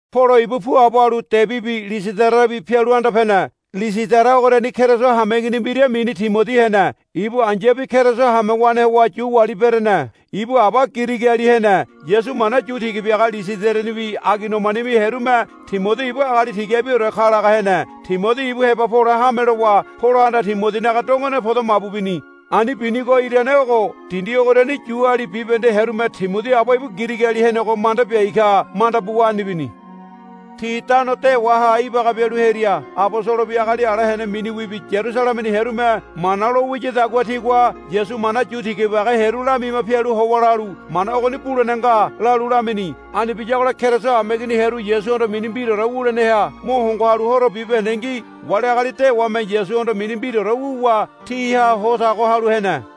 Polo ibu puabo halu Debibi Lisidarabi pialu anda pene. Lisidara ogoriani Keriso hameigini mbira mini Timodi hene. Ibu ai̱yabi Keriso hamewane howa Yu wali berene. Ibu aba Girigiali hene. Yasu mana yu tiga biaga Lisidaranibi Aigoniamanibi hearume Timodi ibu agali tigabiore ka laga hene. Timodi ibu heba pole hame lowa Polohanda Timodinaga dongone podo mabu bini. Ani binigo irane ogo. Dindi ogoriani Yuali bibahende hearume Timodi aba ibu Girigiali henego manda biai ka manda buwa ani bini. Ti tano dewaha ibaga bialu hearia abosolobi agali ala hene miniwibi Yarusalemeni hearume mana lo wiyadagua tigua Yasu mana yu tiga biaga hearu lamima pialu howa lalu, Mana ogoni bulene nga, lalu lamini. Ani biyagola Keriso hameigini hearu Yasuhondo mini mbiraore wuleneha mo hongo halu horo bibahendengi wali agali dewame Yasuhondo mini mbiraore wuwa tiha ho tago halu hene.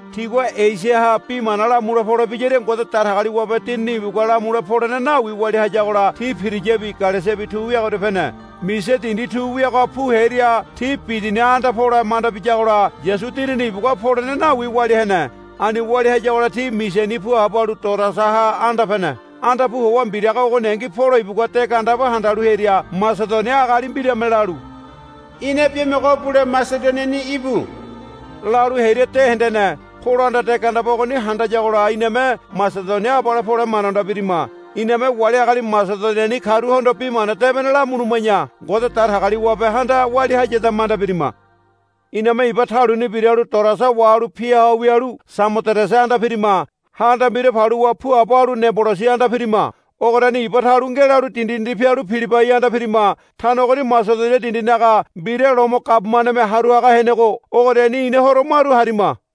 Tigua Esiaha bi mana lamule pole biyaria Ngode Datagaliwabe Dinini ibugua lamule polene nawi walia hayagola ti Piriyabi Galesiabi tu wiagoria pene. Misia dindi tu wiagoha pu hearia ti Bidiniaha anda pole manda biyagola Yasu Dinini ibugua polene nawi walia hene. Ani walia hayagola ti Misiani puabo halu Toroasaha anda pene. Anda pu howa mbiraga ogoningi Polo ibugua de gandeba handalu hearia Masedonia agali mbirame lalu, Ina biamogo bule Masedoniani íbu, lalu hearia de hendene. Polohanda de gandeba ogoni handayagola iname Masedonia abale pole manda manda birima. Iname wali agali Masedoniani karuhondo Bi Mana Debene lamuluma̱ya Ngode Datagaliwabehanda walia hayida manda birima. Iname iba taluni biralu Toroasa wahalu pia ho wialu Samoderese anda pirima. Ha anda mbira paluwa puabo halu Neabolisi anda pirima. Ogoriani iba talu ngelalu dindi dindi pialu Pilibai anda pirima. Tano ogoni Masedonia dindinaga mbira Lomo gabumaneme haru haga henego ogoriani ina horo maru harima.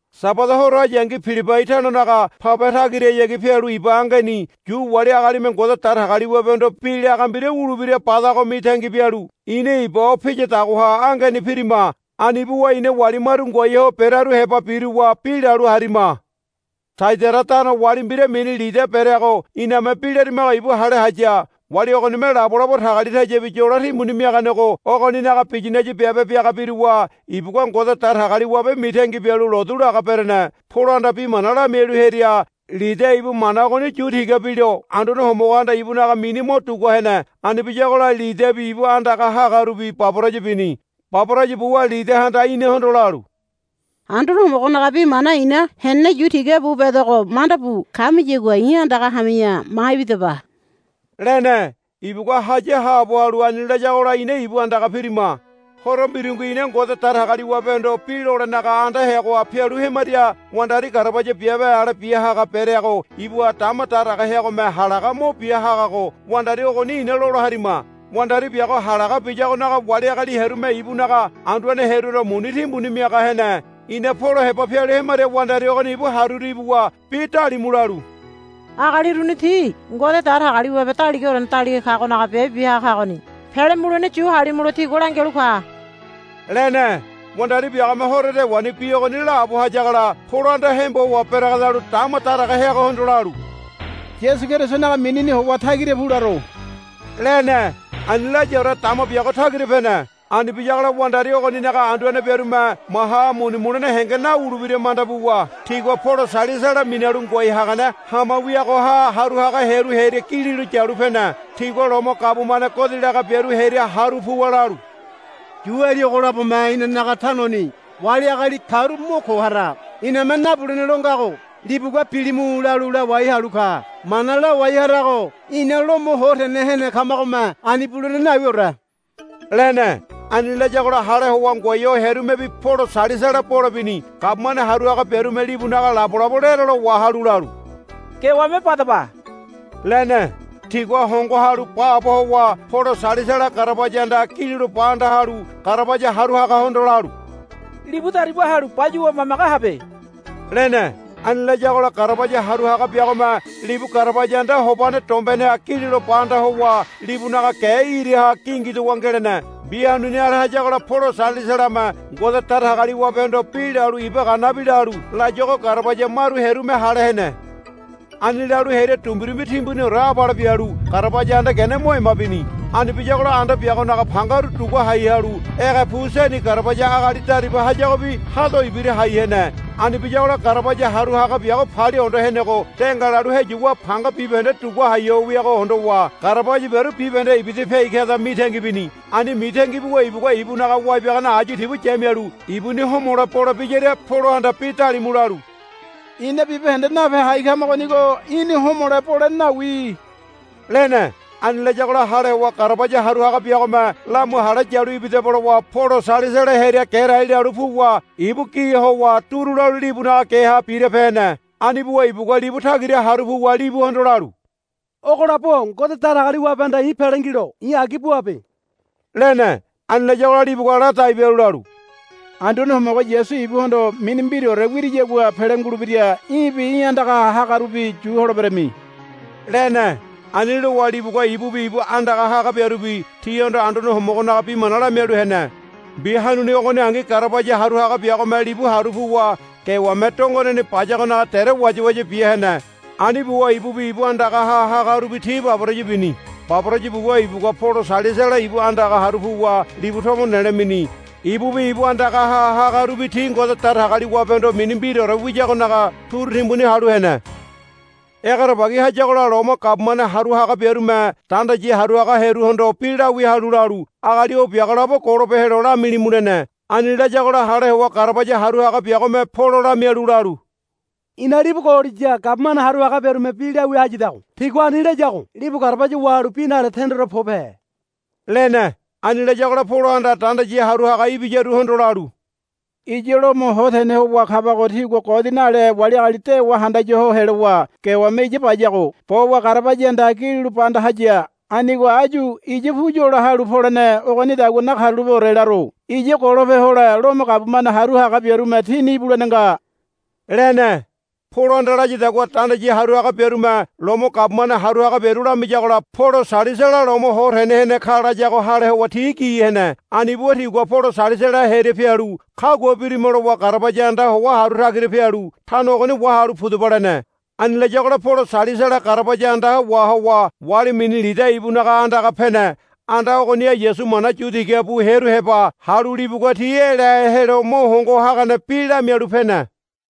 Sabada horo hayangi Pilibai tanonaga pabe tagirahayagi pialu iba angeni Yu wali agalime Ngode Datagaliwabehondo bi laga mbira wulebira badago mitangi bialu ina iba o piyadagoha angeni pirima. Ani buwa ina wali maru ngoai ho berearu heba biruwa bi lalu harima. Taiadaira tano wali mbira mini Lidia bereago iname bi larimago ibu hale haya. Wali ogonime labolabo tagalitayabi yolo timbuni miaganego ogoninaga biyinaya biabe biaga biruwa ibugua Ngode Datagaliwabe mitangi bialu lotu laga berene. Polohanda bi mana lamialu hearia Lidia ibu mana ogoni yu tiga bilo Anduane Homogohanda ibunaga mini mo dugua hene. Ani biyagola Lidiabi ibu andagaha hagarubi baboraya bini. Baboraya buwa Lidiahanda inahondo lalu, Anduane Homogonaga bi mana i̱na henene yu tiga bu bedogo manda bu kamiyagua i̱ andaga hami̱ya ma ibidaba, lene. Ibugua haya haabo halu ani layagola ina ibu andaga pirima. Horo mbirungi ina Ngode Datagaliwabehondo bi lolenaga anda heagoha pialu hemaria wandari garabaya biabe ale bia haga bereago ibuha dama daraga heagome halaga mo bia hagago wandari ogoni ina lola harima. Wandari biago halaga biyagonaga wali agali hearume ibunaga anduane hearuhondo muni timbuni miaga hene. Ina Polo heba pialu hemaria wandari ogoni ibu haruru ibuwa bi dalimu lalu, Agali uruni ti Ngode Datagaliwabe Daligaorene Daliga Kagonaga biabe bia haga kagoni. Pele mulene yu halimulo tigua langialu ka, lene. Wandari biagome horo dewani bi ogoni laabo hayagola Polohanda hembo howa beregedalu dama daraga heagohondo lalu, Yasu Kerisonaga minini howa tagira pu laro, lene. Ani layaore dama biago tagira pene. Ani biyagola wandari ogoninaga anduane biarume maha muni mulene henge nawulebira manda buwa tigua Polo Sailasala minalu ngoai hagane hama wiagoha haru haga hearu hearia gililo yalu pene. Tigua Lomo gabumane godi laga biaru hearia haru puwa lalu, Yuali ogo labome inanaga tanoni wali agali karu mo ko hara. Iname nabulene lo ngago libugua, Bilimu, lalu lawai halu ka. Mana lawai harago ina Lomo ho tene hene kamagome ani bulene nawiore, lene. Ani layagola hale howa ngoai ho hearumebi Polo Sailasala bole bini. Gabumane haru haga biarume libunaga labolabo lerelo wahalu lalu, Gewame badaba, lene. Tigua hongo halu baabo howa Polo Sailasala garabaya andaha gililo ba anda halu garabaya haru hagahondo lalu, Libu dariba halu bayuwa mamage habe, lene. Ani layagola garabaya haru haga biagome libu garabaya anda hobane dombeneha gililo ba anda howa libunaga ge iraha gingidowa ngelene. Mbi hanuni ale hayagola Polo Sailasalame Ngode Datagaliwabehondo bi lalu iba ganabi lalu layuago garabaya maru hearume hale hene. Ani lalu hearia dumbirumbi timbuniore abale bialu garabaya anda gene mo ema bini. Ani biyagola anda biagonaga pangaru dugua hai halu ege pu seni garabaya agali dariba hayagobi hado ibira hai hene. Ani biyagola garabaya haru haga biago palia hondo henego de ngalalu heyuwa panga bibahende dugua hai ho wiago hondowa garabaya biaru bibahende ibida piai kada mitangi bini. Ani mitangi buwa ibugua ibunaga wai biagane ayu tibu yamialu ibuni homole bole biyaria Polohanda bi dalimu lalu, Ina bibahende nape hai kamagonigo í̠na homole bolene nawi, lene. Ani layagola hale howa garabaya haru haga biagome, Lamu hale yalu ibidaba, lowa Polo Sailasala hearia gerai lalu puwa ibu gi howa duru lalu libunaga geha birape hene. Ani buwa ibugua libu tagira haru puwa libuhondo lalu, Ogo labo-o Ngode Datagaliwabehanda i̱ pele ngilo i̱ agi buabe, lene. Ani layagola libugua ladai bialu lalu, Anduane Homogo Yasu ibuhondo mini mbiraore wiriyagua pele ngulebira. Í̠bi í̠ andagaha hagarubi yu holeberami, lene. Ani lowa libugua ibubi ibu andagaha haga biarubi tihondo Anduane Homogonaga bi mana lamialu hene. Mbi hanuni ogoningi garabaya haru haga biagome libu haru puwa gewame dongoneni bayagonaga dere wayawaya bia hene. Ani buwa ibubi ibu andagaha hagarubi ti baboraya bini. Baboraya buwa ibugua Polo Sailasala ibu andaga haru puwa libu tomo nelo mini. Ibubi ibu andagaha hagarubi ti Ngode Datagaliwabehondo mini mbiraore wiyagonaga turu timbuni halu hene. Egerebagi hayagola Lomo gabumane haru haga biarume dandayi haru haga hearuhondo bi lawia halu lalu, Agali o biago labo golope helo lamilimu, lene. Ani layagola hale howa garabaya haru haga biagome Polo lamialu lalu, I̱na libu gololiya gabumane haru haga biarume bi lawia hayadago. Tigua ani layago libu garabaya wahalu bi nale tendore pobehe, lene. Ani layagola Polohanda dandayi haru haga ibiyaruhondo lalu, Iya Lomo ho tene howa kabago tigua godi nale wali agali dewa handaya ho helowa gewame iya bayago. Bowa garabaya andaha gililo ba anda haya. Anigo áyu iya pu yola halu polene ogonidagua nakarulapeore laro. Iya golope hole Lomo gabumane haru haga biarume tini ibulene nga, lene. Polohanda layadagua dandayi haru haga biarume Lomo gabumane haru haga biaru lamiyagola, Polo Sailasala Lomo ho tene hene ka, layago hale howa ti gi hene. Ani buwa tigua Polo Sailasala hearia pialu, Kagua birima, lowa garabaya andaha howa haru tagira pialu, Tano ogoni wahalu pudaba, lene. Ani layagola Polo Sailasala garabaya anda wahowa wali mini Lidia ibunaga andaga pene. Anda ogoniha Yasu mana yu tiga bu hearu heba halu libugua ti elahe helo mo hongo hagane bi lamialu pene.